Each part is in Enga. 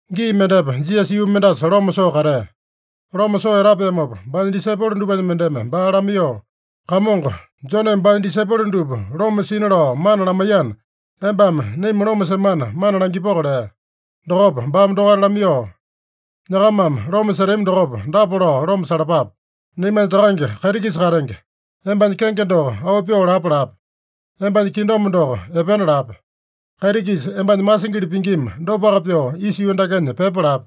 Gii mendepa Jisasa yuu mendasa loma soo katea. Loma soo etapeamopa, baanya disaipolo dupanya mendeme baa lamaiyoo, “Kamongo, Joneme baanya disaipolo dupa loma sina lao mana lamaiyana, embame naima loma semana mana langipoko” lea. Dokopa baame dokaita lamaiyoo, “Nyakamame loma setami dokopa, dapa lao loma salapape: ‘Naimanya Takange kaiti-kisa katenge, embanya kenge doko auu pyoo lapa lape. Embanya kingdom doko epena lape. Kaiti-kisa embanya masingili pingima, dopaka pyoo isa yuu dakenya pyepa lape.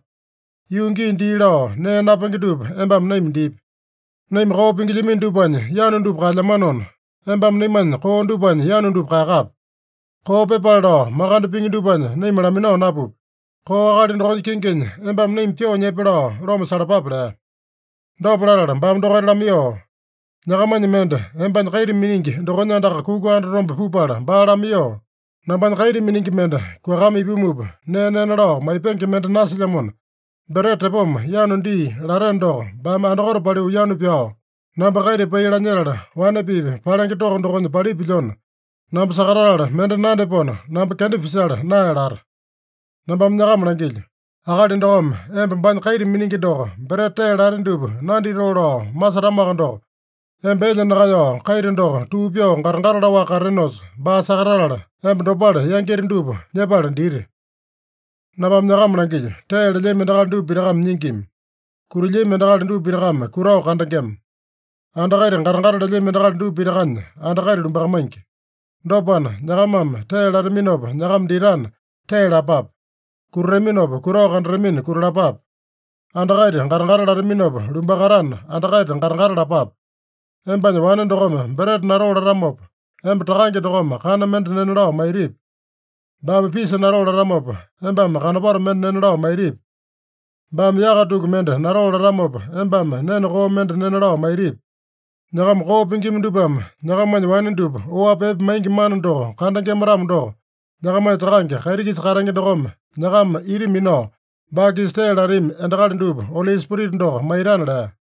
Yuu gii dii lao nee napenge dupa embame naima dipi. Naima koo pingilyamino dupanya yanu dupa kaelyamanona, embame naimanya koo dupanya yanu dupa kaeyakape. Koo pyepale lao makande pingi dupanya naima laminao napupi. Koo akali dokonya kinginya embame naima pyoo nyepe’ lao loma salapape” lea. Dopa latala baame dokaita lamaiyoo, “Nyakamanya mende embanya kaita miningi dokonya andaka kuka andatombe pupala baa lamaiyoo, ‘Nambanya kaita miningi mende kuakama ipumupa, nee nena lao maipenge mende nasilyamona, breta tepoma yanu dii’ lateno doko, baame andakote paliu yanu pyao, ‘Namba kaita pai lanyetala, wane-pipa palenge toko dokonya palipilyona, namba sakatatala mende nandyapona, namba kenda pisala nae’ lata. Nambame nyakama langilyo: Akali dokome emba baanya kaita miningi doko breta tee late dupa nanditoo lao masetamoaka doko, emba elya nakaeyao kaita doko tuu pyoo gata-gata laowaka katatenosa, baa sakatatala, emba dopale yangita dupa nyepala dita. Nambame nyakama langilyo: Tee lelyami endakali dupa pitakame nyingima. Kutilyami endakali dupa pitakame kutao kandengema. Anda kaita gata-gata lelyami endakali dupa pitakanya anda kaita lumbakamaingi. Dopana, nyakamame tee lataminopa nyakama ditana, tee lapape. Kutataminopa kutao kandatamina, kutalapape. Anda kaita gata-gata lataminopa lumbakatana, anda kaita gata-gata lapape. Embanya wane dokome breta natoo latamopa, emba takange dokome kana mende nena lao maitipi? Baame pisa natoo latamopa, embame kanopato mende nena lao maitipi? Baame yaka tuku mende natoo latamopa, embame nene koo mende nena lao maitipi? Nyakama koo pingima dupame nyakamanya wane dupa oapi epe maingi mana doko kandengema-tamo doko, nyakamanya Takange kaiti-kisa katenge dokome nyakama ita minao, baa-kisa tee latami endakali dupa Oli Spirita doko maitana” lea.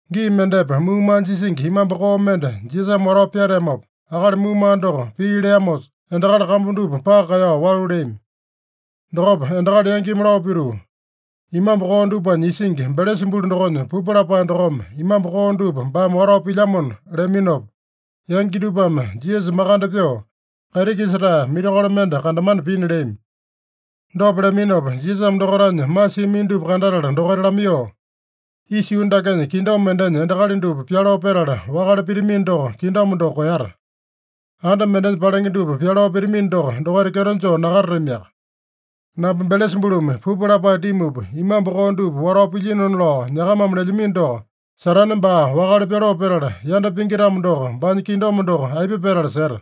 Gii mendepa muumaa jisingi, imambu koo mende Jisasame watao pyateamopa, akali muumaa doko pii leamosa, endakali kambu dupa paka kaeyao walu leami. Dokopa endakali yangimi lao pituu, “Imambu koo dupanya isingi, Belesabulu dokonya pupu lapae dokome imambu koo dupa baame watao pilyamona” leaminopa, yangi dupame Jisasa makande pyoo, kaiti-kisa-tae mirakolo mende kandamana pina leami. Dopa leaminopa, Jisasame dokaitanya masiamino dupa kandatala dokaita lamaiyoo, “Isa yuu dakenya kingdom mendenya endakali dupa pyaloo petala wakale pitamino doko, kingdom doko koeyata. Anda mendenya palenge dupa pyaloo pitamino doko, dokaita kyeto joo nakatatamiaka. Namba Belesabulumi pupu lapae dimupa, imambu koo dupa watao pilyinona lao nyakamame lelyamino doko, Satane baa wakale pyaloo petala, yanda pingi-tamo doko, baanya kingdom doko aipa petala seta?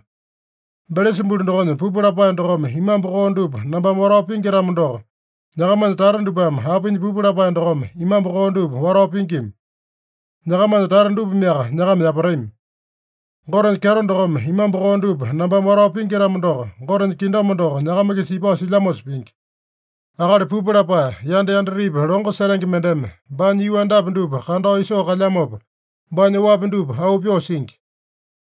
Belesabulu dokonya pupu lapae dokome imambu koo dupa nambame watao pingi-tamo doko, nyakamanya tata dupame apinya pupu lapae dokome imambu koo dupa watao pingima? Nyakamanya tata dupameaka nyakama yapatami. Gotenya kyeto dokome imambu koo dupa nambame watao pingi-tamo doko, Gotenya kingdom doko nyakama-kisa ipao silyamosa pingi. Akali pupu lapae, yanda yandatepi longo setenge mendeme baanya yuu andapi dupa kandao isoo kalyamopa, baanya oapi dupa auu pyoo singi.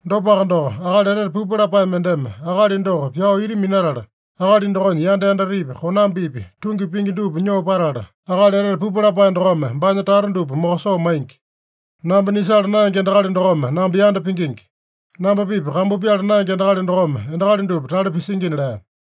Dopaka doko, akali etete pupu lapae mendeme akali doko pyao ita minatala, akali dokonya yanda yandatepi, konambipi, tungi pingi dupa nyoo patala, akali etete pupu lapae dokome baanya tata dupa mokosoo maingi. Namba nisala naenge endakali dokome namba yanda pingingi. Namba-pipa kambu pyala naenge endakali dokome endakali dupa tale pisingina” lea.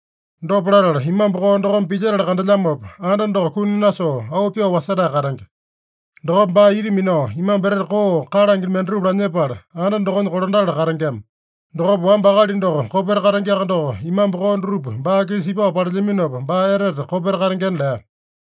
Dopa latala, imambu koo dokome pilyetala kandelyamopa, anda doko kuni nasoo, auu pyoo wasetae katenge. Dokopa baa ita minao imambu etete koo kalange mendatupa lanyepala, anda dokonya kolandatala katengema. Dokopa, wamba akali doko kopeta katengeaka doko, imambu koo dutupa baa-kisa ipao palelyaminopa, baa etete kopeta katengena” lea.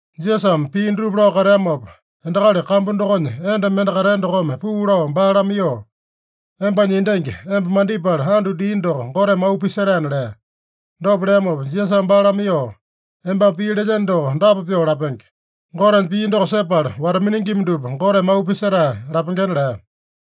Jisasame pii dutupa lao kateamopa, endakali kambu dokonya enda mende katea dokome puu lao baa lamaiyoo, “Embanya endangi, emba mandipala andu dia doko, Goteme auu pisetaena” lea. Dopa leamopa Jisasame baa lamaiyoo, “Embame pii lelyeno doko dapa pyoo lapenge: Gotenya pii doko sepala wata-miningima dupa Goteme auu pisetae lapengena” lea.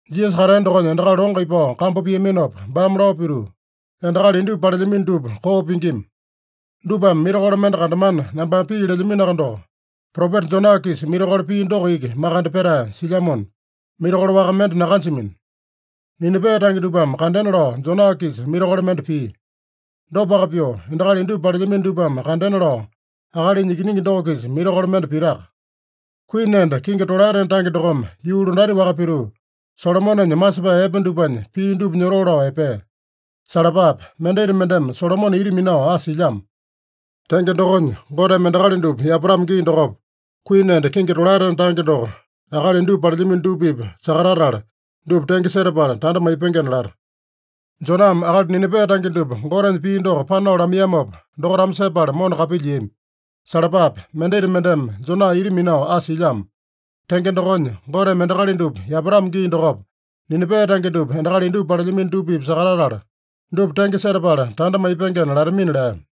Jisasa katea dokonya endakali longo ipao kambu piaminopa, baame lao pituu, “Endakali indupa palelyamino dupa koo pingima. Dupame mirakolo mende kandamana nambame pii lelyaminoaka doko, propeta Jona-kisa mirakolo pia doko iki makande petae silyamona, mirakolo waka mende nakanjamino. Ninipe tange dupame kandena lao Jona-kisa mirakolo mende pia. Dopaka pyoo, endakali indupa palelyamino dupame kandena lao Akalinya Ikiningi doko-kisa mirakolo mende pitaka. Kuini enda kingi tolaetena tange dokome yuu londati-waka pituu, Solomonenya masepae epe dupanya pii dupa nyotoo lao epea. Salapape! Mendita mendeme Solomone ita minao asa silyamo. Tenge dokonya, Goteme endakali dupa yapatamo gii dokopa, kuini enda kingi tolaetena tange doko akali indupa palelyamino dupa-pipa sakatatala, dupa tenge setapala tanda maipengena lata. Joname akali Ninipe tange dupa Gotenya pii doko panao lamaiyamopa, dokaitame sepala mona kapilyiami. Salapape! Mendita mendeme Jona ita minao asa silyamo. Tenge dokonya, Goteme endakali dupa yapatamo gii dokopa, Ninipe tange dupa endakali indupa palelyamino dupa-pipa sakatatala, dupa tenge setapala tanda maipengena latamina” lea.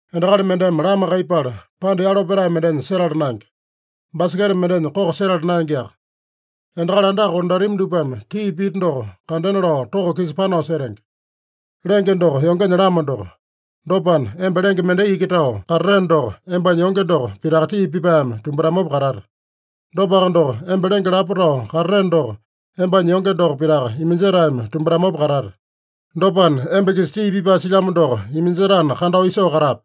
“Endakali mendeme lama kaiyepala, panda yalo petae mendenya setala naenge. Baseketa mendenya koko setala naengeaka. Endakali andaka kolandatami dupame tii pita doko kandena lao toko-kisa panao setenge. Lenge doko yongenya lama doko. Dopana, emba lenge mendai iki tao katateno doko, embanya yonge doko pitaka tii pipaeme tumbatamopa katate. Dopaka doko, emba lenge lapo tao katateno doko, embanya yonge doko pitaka iminjetaeme tumbatamopa katate. Dopana, emba-kisa tii pipae silyamo doko iminjetana, kandao isoo katape.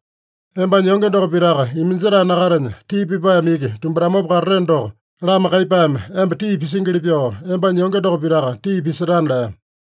Embanya yonge doko pitaka iminjetae nakatenya, tii pipaeme iki tumbatamopa katateno doko, lama kaiyepaeme emba tii pisingili pyoo, embanya yonge doko pitaka tii pisetana” lea.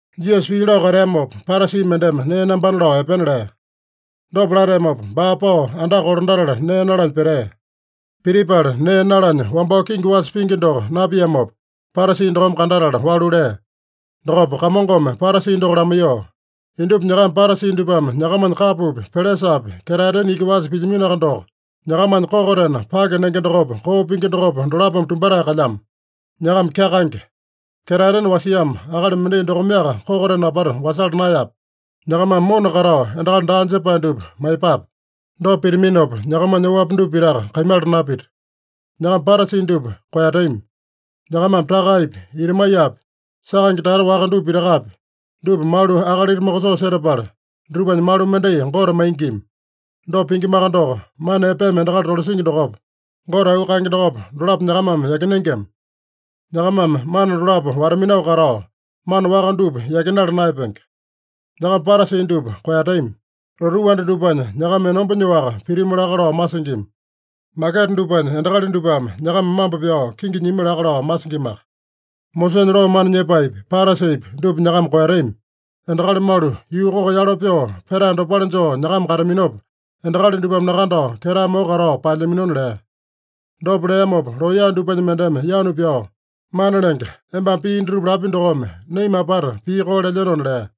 Jisasa pii lao kateamopa, Parasi mendeme nee nambana lao epena lea. Dopa lateamopa, baa pao andaka kolandatala nee nalanya petea. Pitipala nee nalanya wambao kingi wasa pingi doko napiamopa, Parasi dokome kandatala walu lea. Dokopa Kamongome Parasi doko lamaiyoo, “Indupa nyakama Parasi dupame nyakamanya kapopi, pelesapi, ketaetena iki wasa pilyaminoaka doko, nyakamanya kokotena pake nenge dokopa, koo pingi dokopa, dolapome tumbatae kalyamo. Nyakama kyakaenge! Ketaetena wasiamo akali mendai dokomeaka kokotena apata wasala naeyape? Nyakamame mona katao endakali daa jepae dupa maiyepape. Dopa pitaminopa, nyakamanya oapi dupa pitaka kaimala napita. “Nyakama Parasi dupa koeyatami. Nyakamame takaepi, itamaiyapi, sakaenge tata waka dupa pitakapi, dupa malu akalita mokosoo setapala, dutupanya malu mendai Gote maingima. Dopa pingimaka doko, mana epeme endakali tolasingi dokopa, Gote auu kaenge dokopa, dolapo nyakamame yakinengema. Nyakamame mana dolapo wata-minao katao, mana waka dupa yakinala naeyapenge. Nyakama Parasi dupa koeyatami. Lotuu anda dupanya nyakama enomba nyoaka pitimu laka lao masingima. Maketa dupanya endakali dupame nyakama mambo pyao kingi nyimi laka lao masingimaka. Mosesanya loo mana nyepaepi, Parasipi, dupa nyakama koeyatami. Endakali malu yuu koko yalo pyoo petae dopale joo nyakama kataminopa, endakali dupame nakandao ketae moko katao paelyaminona” lea. Dopa leamopa looya dupanya mendeme yanu pyao, “Mana Lenge, embame pii dutupa lapi dokome, naima apata pii koo lelyenona” lea.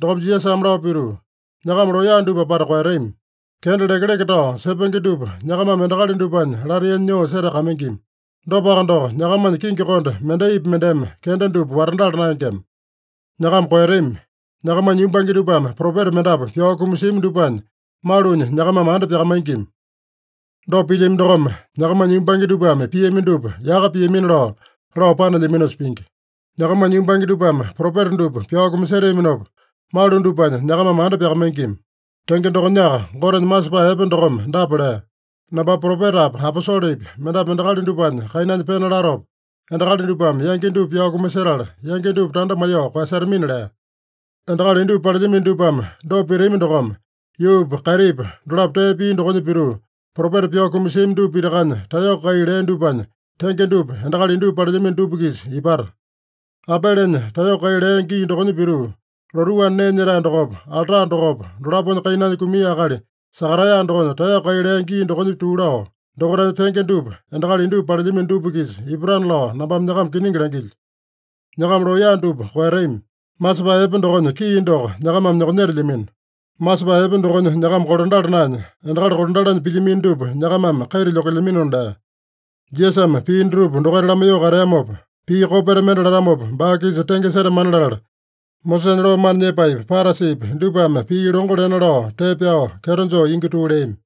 Dokopa Jisasame lao pituu, “Nyakama looya dupa apata koeyatami. Kenda lekeleke tao sepenge dupa nyakamame endakali dupanya lataiyanya nyoo setakamaingima. Dopaka doko, nyakamanya kingi konde mendaipi mendeme kenda dupa watandala naengema. Nyakama koeyatami. Nyakamanya yumbange dupame propeta mendapu pyao kumasiami dupanya malunya nyakamame anda pyakamaingima. Dopa pilyami dokome, nyakamanya yumbange dupame piami dupa yaka piamina lao, lao panelyaminosa pingi. Nyakamanya yumbange dupame propeta dupa pyao kumaseteaminopa, malu dupanya nyakamame anda pyakamaingima. Tenge dokonyaka Gotenya masepae epe dokome dapa lea: ‘Nambame propetapi, aposolepi mendapu endakali dupanya kainanya pena latopa, endakali dupame yangi dupa pyao kumasetala, yangi dupa tanda maiyoo koeyasetamina’ lea. Endakali indupa palelyamino dupame dopa pitami dokome, yuupa kaitipa dolapo tee pia dokonya pituu, propeta pyao kumasiami dupa pitakanya taeyoko kai lea dupanya tenge dupa endakali indupa palelyamino dupa-kisa ipata. Abelenya taeyoko kai lea gii dokonya pituu, lotuu anda nee nyetae dokopa, alta dokopa, dolaponya kainanya kumia akali Sakaraeya dokonya taeyoko kai lea gii dokonya tuu lao, dokaitanya tenge dupa endakali indupa palelyamino dupa-kisa ipatana lao nambame nyakama kiningi langilyo. Nyakama looya dupa koeyatami. Masepae epe dokonya kii doko nyakamame nyokonyetelyamino. Masepae epe dokonya nyakama kolandala naenya, endakali kolandalanya pilyamino dupa nyakamame kaita lyokelyaminona” lea. Jisasame pii dutupa dokaita lamaiyoo kateamopa, pii kopeta mende latamopa, baa-kisa tenge setamana latala, Mosesanya loo mana nyepaepi, Parasipi dupame pii longo lena lao tee pyao kyeto joo ingi tuu leami.